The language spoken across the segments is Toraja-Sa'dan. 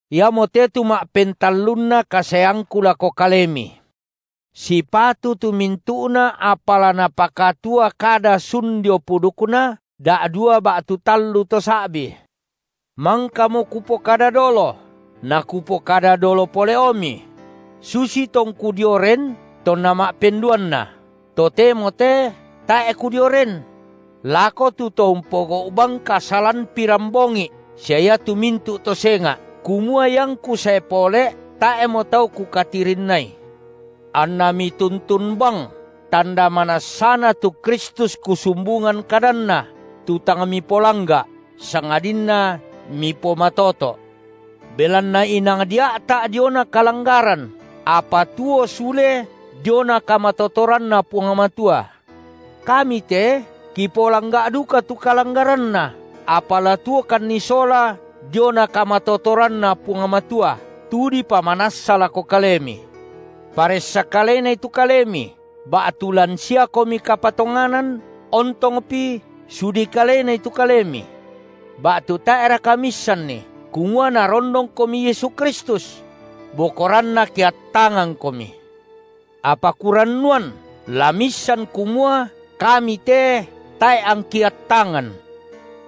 Iamote tu ma’pentallunna kasaeangku lako kalemi. Sipatu tu mintu’na apa la napakatua kada sun dio pudukna da’dua ba’tu tallu to sa’bi. Mangkamo kupokada dolo, na kupokada dolo pole’omi, – susi tongku dio ren tonna ma’penduanna, totemo te tae’ kudio ren –, lako tu to umpogau’ bang kasalan pirambongi’ sia iatu mintu’ to senga’, kumua iangku sae pole’, tae’mo tau kukatirinnai; anna mituntun bang tanda manassana tu Kristus kusumbungan kadanNa, tu tang mipolangga’, sangadinna mipomatoto’. Belanna inang dia’ta’ diona kalanggaran, apa tuo sule diona kamatotoranNa Puang Matua. Kami te kipolangga’ duka tu kalanggaranNa, apa la tuokanni sola diona kamatotoranNa Puang Matua, tu dipamanassa lako kalemi. Paressa kalenai tu kalemi, ba’tu lan siakomi kapatonganan, ontongpi sudi kalenai tu kalemi. Ba’tu tae’raka miissanni kumua Narondongkomi Yesu Kristus? Bokoranna ke attangangkomi. Apa kurannuan la miissan kumua kami te tae’ angki attangan.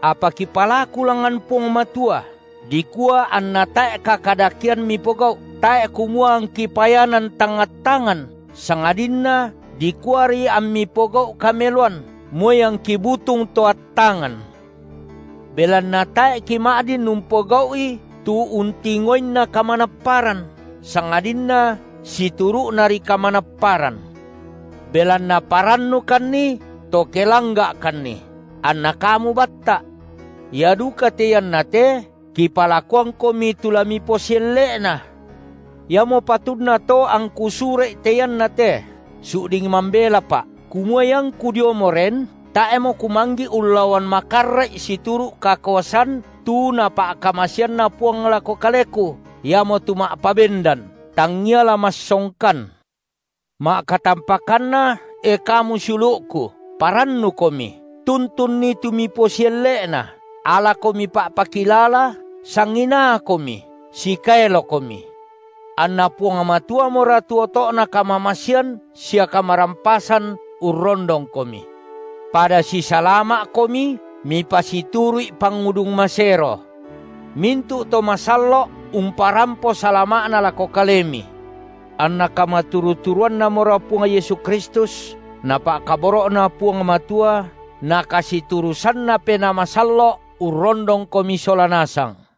Apa kipalaku langngan Puang Matua dikua anna tae’ kakadakean mipogau’, tae’ kumua angki payanan tang attangan, sangadinna dikuari ammi pogau’ kameloan, moi angki butung to attangan. Belanna tae’ kima’din umpogau’i tu untingoinna kamanapparan, sangadinna situru’nari kamanapparan. Belanna parannukanni, to ke langga’kanni, anna kamu batta’. Ia duka te iannate kipalakuangkomi tu la miposielle’na. Iamo patunna to angku sura’i te iannate, su’ding mambelapa’, kumua iangku diomo ren, tae’mo kumanggi’ ullaoan makarra’i situru’ kakuasan tu Napa’kamasean Puang lako kaleku, iamotu ma’pabendan, tangngia la massongkan. Pa’pakilala sia pangandona rasulu’ Ma’katampakanna, e kamu siulu’ku, parannukomi, tuntunni tu miposielle’na, alakomi pa’pakilala, sanginaakomi, sikaelokomi. AnNa Puang Matuamora tu oto’na kamamasean sia kamarampasan urrondongkomi. Pada sisalama’komi mipasituru’i pangudung masero. Mintu’ to masallo’ umparampo salama’na lako kalemi. Anna kamaturu-turuanNamora Puang Yesu Kristus na pa’kaboro’Na Puang Matua na kasiturusanNa Penaa Masallo’ urrondongkomi sola nasang.